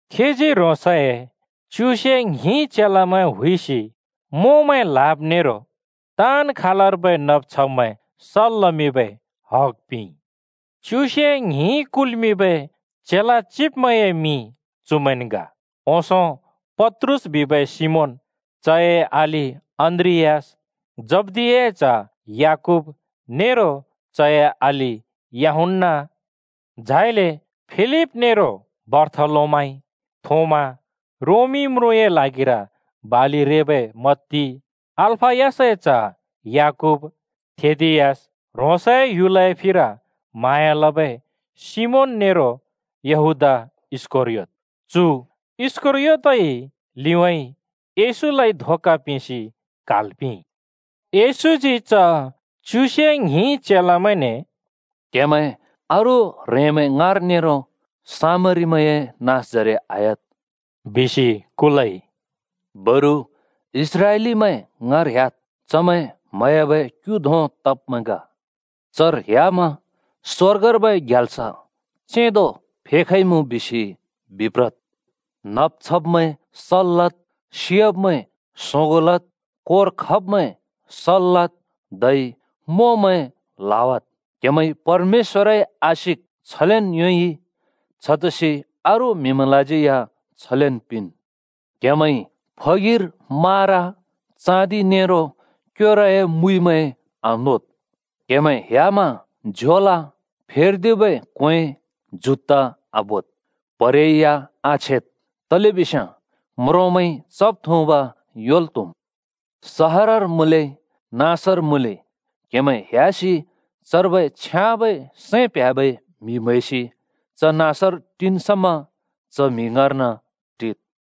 खीजी ह्रोंसए च्युसे ङ्हिं चेलामैं हुइसि मोंमैं ल्‍हाब नेरो ताँन् खालर्बै नब् छब्मैं सल् लमिंबै हग पिंइ। च्युसे ङ्हिं कुल्मिंबै चेला चिब्मैंए मिं चुमैंन् ग: ओंसों पत्रुस बिबै सिमोन, चए अलि अन्‍द्रियास, जब्दियाए च्ह याकूब नेरो चए अलि यूहन्‍ना, झाइले फिलिप नेरो बारथोलोमाइ, थोमा, रोमी म्रुँए ल्हागिर बालि रेबै मत्ती, अल्‍फयसए च्‍ह याकूब, थेदियस, ह्रोंसए ह्‍युलए फिर म्हाँया लबै सिमोन नेरो यहूदा इस्‍करियोत। चु इस्‍करयोतइ लिउँइँ येशूलाइ धोका पिंसि क्हाल् पिंइ। येशूजी च च्युसे ङ्हिं चेलामैंने “क्‍हेमैं अरू ह्रेंमैं ङाँर नेरो सामरीमैंए नाँसजरे आह्‍याद्,” बिसि कुलइ। “बरु इस्राएलीमैं ङाँर ह्‍याद्। चमैं म्‍हयाबै क्‍यु धों तब्‍मैं ग। चर ह्‍यामा ‘स्वर्गर्बै ग्याल्स चेंदो फेखइमुँ,’ बिसि बिप्रद्। नब् छब्मैं सल् लद्, सि‍याब्‍मैं सोंगों लद्, कोर खब्‍मैं सल् लद् धै मोंमैं ल्‍हावाद्। क्‍हेमैंइ परमेश्‍वरए आशिक छलेन् योंइ, छतसि अरू म्‍हिमैंलाज्यै या छलेन् पिंन्। “क्हेमैंइ फगिर मारा, चाँदि नेरो क्‍योरए मुइमैं आनोद्। क्हेमैं ह्‍यामा झोला, फेर्दिबै क्‍वें, जुत्ता आबोद्, प्‍हरे या आछेद्, तलेबिस्याँ म्रोंमैंइ चब्-थुँब् योंल् त्हुम्। “सहरर मुँले नाँसर मुँले क्हेमैं ह्‍यासि चर्बै छ्याँबै सैं प्ह्‍याबै म्‍हि म्हैसि च नाँसर टिन् समा च म्‍हि ङाँर्न टिद्।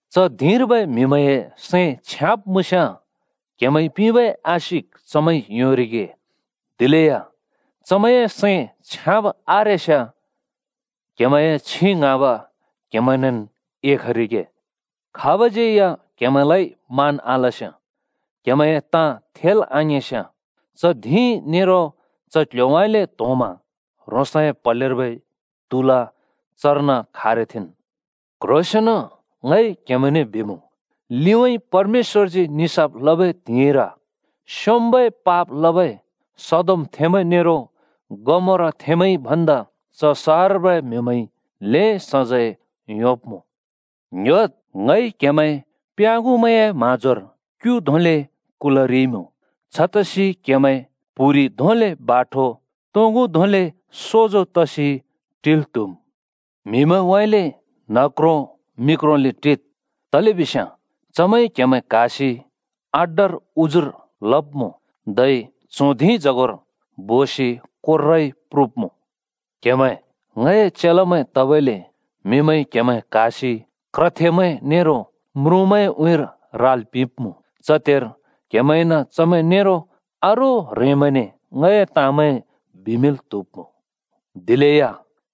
च धिंर्बै म्‍हिमैंए सैं छ्याँब मुँस्‍याँ क्‍हेमैंइ पिंबै आशिक चमैंइ योंरिगे, दिलेया चमैंए सैं छ्याँब आरेस्‍याँ क्‍हेमैंए छिं ङ्हाँब क्हेमैंनेन् एखरिगे। खाबज्यै या क्‍हेमैंलाइ मान आलस्‍याँ, क्‍हेमैंए ताँ थेल् आङिंस्‍याँ च धिं नेरो च क्ल्ह्‍योउँइँले त्होंमा ह्रोंसए प्‍हलेर्बै त्‍हुला चर्न खारथेंन्। क्ह्रोंसेंन ङ क्हेमैंने बिमुँ, लिउँइँ परमेश्‍वरजी निसाफ लबै त्हिंइर स्‍योंम्‍बै पाप लबै सदोमथेंमैं नेरो गमोराथेंमैंइ भन्दा च सहरर्बै म्‍हिमैंइ ल्हें सजैं योंब्मुँ।” “ङ्‍ह्‍योद्! ङइ क्‍हेमैं प्याँगुमैंए म्हाँजोर क्यु धोंले कुलरिइमुँ। छतसि क्‍हेमैं प्‍हुरि धोंले बाठो, तोंगु धोंले सोजो तसि टिल् त्‍हुम्। म्‍हिमैंउँइँले न्हक्रों मि क्रोंले टिद् तलेबिस्याँ चमैंइ क्‍हेमैं क्‍हासि अड्डर उजुर लब्‍मुँ, धै च्हों धिंजगोर बोसि कोर्राइ प्रुब्‍मुँ। क्‍हेमैं ङए चेलामैं तबइले म्हिमैंइ क्‍हेमैं क्हासि क्रथेमैं नेरो म्रुँमैंए उँइँर राल् पिंब्‍मुँ। च त्हेर क्‍हेमैंइन चमैं नेरो अरू ह्रेंमैंने ङए ताँमैं बिमिंल् त्‍हुब्‍मुँ। दिलेया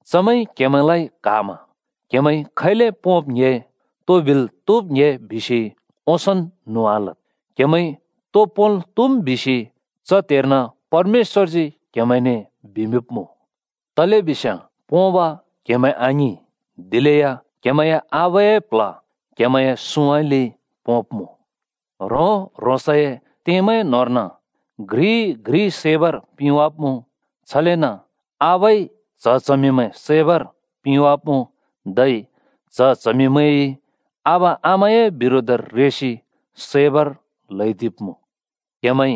चमैंइ क्‍हेमैंलाइ क्‍हामा क्‍हेमैंइ खैले पोंब् ङ्‍हे तो बिल् त्हुब् ङ्‍हे बिसि ओंसोंन् न्हुँ आलद्। क्‍हेमैंइ तो पोंल् त्‍हुम् बिसि च त्हेर्न परमेश्‍वरजी क्‍हेमैंने बिमिंब्मुँ। तलेबिस्याँ पोंब क्‍हेमैं आङिं, दिलेया क्हेमैंए आबाए प्ल्ह क्‍हेमैंए सुँउँइँले पोंब्‍मुँ। “ह्रों-ह्रोंसए त्येमैं न्होंर्न घ्रिइ-घ्रि सैबर पिंवाब्मुँ। छलेन आबाइ च्‍ह-च्हमिमैं सैबर पिंवाब्मुँ, धै च्‍ह-च्हमिंमैंइ आबा-आमामैंए बिरोधर रेसि सैबर ल्हैदिब्मुँ। क्हेमैंइ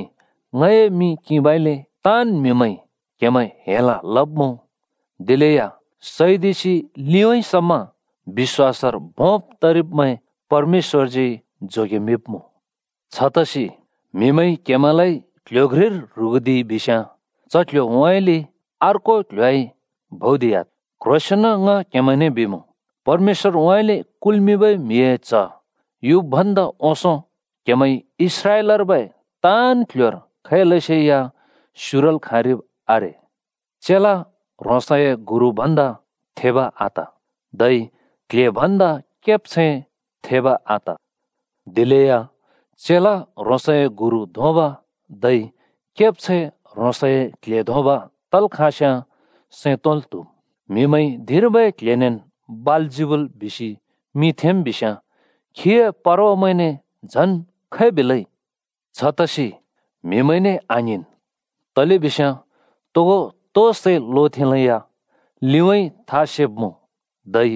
ङए मिं किंबइले ताँन् म्‍हिमैंइ क्‍हेमैं हेल लब्‍मुँ। दिलेया सैदिसि लिउँइँ समा बिश्‍वासर भोंब् तेरिब्‍मैं परमेश्‍वरजी जोगेमिंब्मुँ। छतसि म्हिमैंइ क्हेमैंलाइ क्ल्ह्‍यो घ्रिर ह्रुगुदिइ बिस्याँ च क्ल्ह्‍योउँइँले अर्को क्ल्ह्‍योउँइँ भौदिह्‍याद्। क्ह्रोंसेंन ङ क्हेमैंने बिमुँ, परमेश्‍वरउँइँले कुल्‍मिंबै म्हिए च्ह युब् भन्दा ओंसों क्‍हेमैंइ इस्राएलर्बै ताँन् क्ल्ह्‍योर खैलसेया स्युरल् खाँरिब् आरे। “चेला ह्रोंसए गुरु भन्दा थेब आत धै क्ल्हे भन्दा केब्छैं थेब आत। दिलेया चेला ह्रोंसए गुरु धोंब धै केब्छैं ह्रोंसए क्ल्हे धोंब तल् खाँस्‍याँ सैं तोंल् त्‍हुम्। म्हिमैंइ धिंर्बै क्ल्हेनेन् बालजिबुल बिसि मिं थेंम् बिस्‍याँ खीए परवामैंने झन् खै बिलै? “छतसि म्‍हिमैंने आङ्हिंन्। तलेबिस्याँ तोगो तो सै लोथेंलेया लिउँइँ था सेब्‍मुँ। धै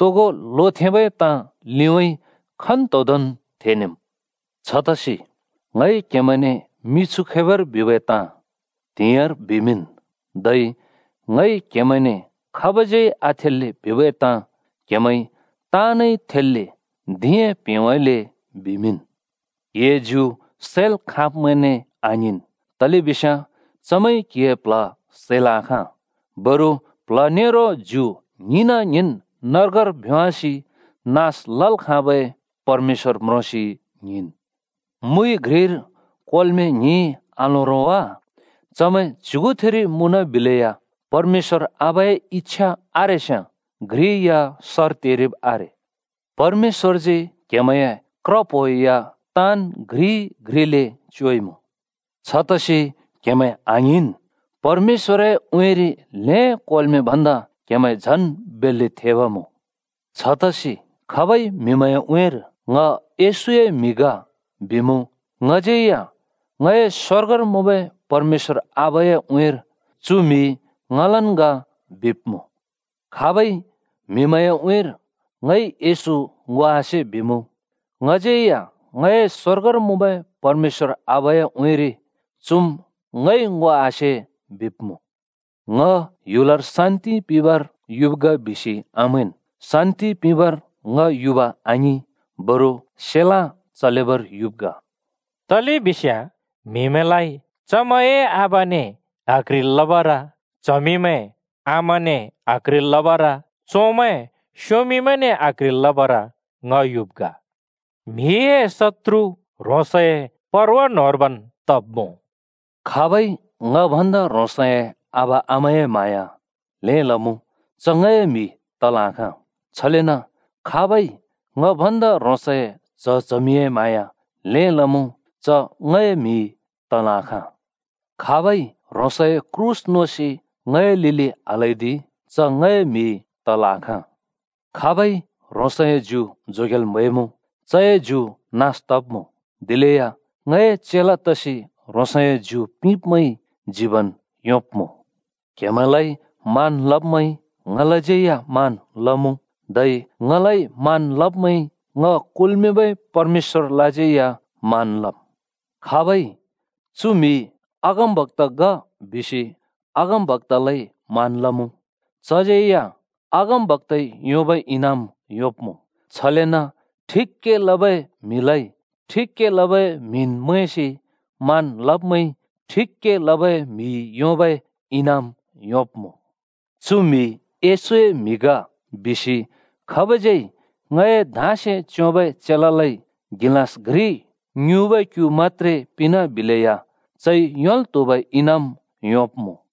तोगो लोथेंबै ताँ लिउँइँ खन्तोदोंन् थेनेम्। छतसि ङइ क्‍हेमैंने मिछु खैबर बिबै ताँ त्‍हिंइर बिमिंन्। धै ङइ क्‍हेमैंने खाबज्यै आथेल्‍ले बिबै ताँ क्हेमैंइ ताँनइ थेल्‍ले धिंए प्हेंउँइँले बिमिंन्। “क्‍हिए ज्यु सैल् खाँब्‍मैंने आङ्हिंन्, तलेबिस्याँ चमैंइ क्‍हिए प्‍ल्‍ह सैल् आखाँ। बरु प्‍ल्‍ह नेरो ज्यु ङ्हिंन-ङ्हिंन् नर्गर भ्‍योंवासि नास लल् खाँबै परमेश्‍वर म्रोंसि ङ्हिंन्। “मुइ घ्रिर कोर्मे ङ्हिं आलों वा? चमैं च्‍युगुथिरि मुँनबिलेया परमेश्‍वर आबाए इच्छा आरेस्याँ घ्रि या सर तेरिब् आरे। परमेश्‍वरजी क्‍हेमैंए क्र प्हो या ताँन् घ्रि-घ्रिले च्‍योइमुँ। छतसि क्हेमैं आङ्हिंन्, परमेश्‍वरए उँइँरि ल्‍हें कोर्मे भन्दा क्‍हेमैं झन् बेल्‍ले थेब् मुँ। “छतसि खाबइ म्‍हिमैंए उँइँर ‘ङ येशूए म्‍हि ग’ बिमुँ, ङज्यै या ङए स्वर्गर मुँबै परमेश्‍वर आबाए उँइँर ‘चु म्‍हि ङलन् ग’ बिब्‍मुँ। खाबइ म्‍हिमैंए उँइँर ‘ङइ येशू ङो आसे’ बिमुँ, ङज्यै या ङए स्वर्गर मुँबै परमेश्‍वर आबाए उँइँरि ‘चुम् ङइ ङो आसे’ बिब्‍मुँ।” “ङ ह्‍युलर शान्‍ति पिंबर युब् ग बिसि आमैंन्। शान्‍ति पिंबर ङ युब आङिं, बरु सेलाँ (तरवार) चलेबर युब् ग।” तलेबिस्याँ म्हिमैंलाइ चमैंए आबाने आक्ह्रिल् लबर, च्हमिमैं आमाने आक्ह्रिल् लबर, चोंमैं स्‍युमिने आक्ह्रिल् लबर ङ युब् ग। म्‍हिए शत्तुर ह्रोंसए परवा न्होंर्बैन् तब्‍मुँ। “खाबइ ङ भन्दा ह्रोंसए आबा-आमाए म्हाँया ल्हें लमुँ, च ङए म्‍हि तल् आखाँ। छलेन खाबइ ङ भन्दा ह्रोंसए च्‍ह-चमिए म्हाँया ल्हें लमुँ च ङए म्‍हि तल् आखाँ। खाबइ ह्रोंसए क्रूस नोसि ङए लिलि आल्‍हैदि च ङए म्‍हि तल् आखाँ। खाबइ ह्रोंसए ज्यु जोगेल् म्‍हैमुँ, चए ज्यु नास तब्‍मुँ। दिलेया ङए चेला तसि ह्रोंसए ज्यु पिंब्मैंइ जीबन योंब्‍मुँ।” “क्‍हेमैंलाइ मान लब्मैंइ ङलाज्यै या मान लमुँ, धै ङलाइ मान लब्मैंइ ङ कुल्‍मिंबै परमेश्‍वरलाज्यै या मान लम्। खाबइ ‘चु म्‍हि अगमबक्‍ता ग,’ बिसि अगमबक्‍तालाइ मान लमुँ, चज्यै या अगमबक्‍ताइ योंबै इनाम योंब्मुँ। छलेन ठिक के लबै म्हिलाइ ठिक के लबै म्हिन् मैंसि मान लब्मैंइ ठिक के लबै म्हिइ योंबै इनाम योंब्मुँ। ‘चु म्‍हि येशूए म्‍हि ग,’ बिसि खाबज्यै ङए धाँसे च्‍योंबै चेलालाइ गिलाँस घ्रि ङ्युँबै क्‍यु मत्‍त्रे पिंनाबिले या चइ योंल् त्हुबै इनाम योंब्‍मुँ।”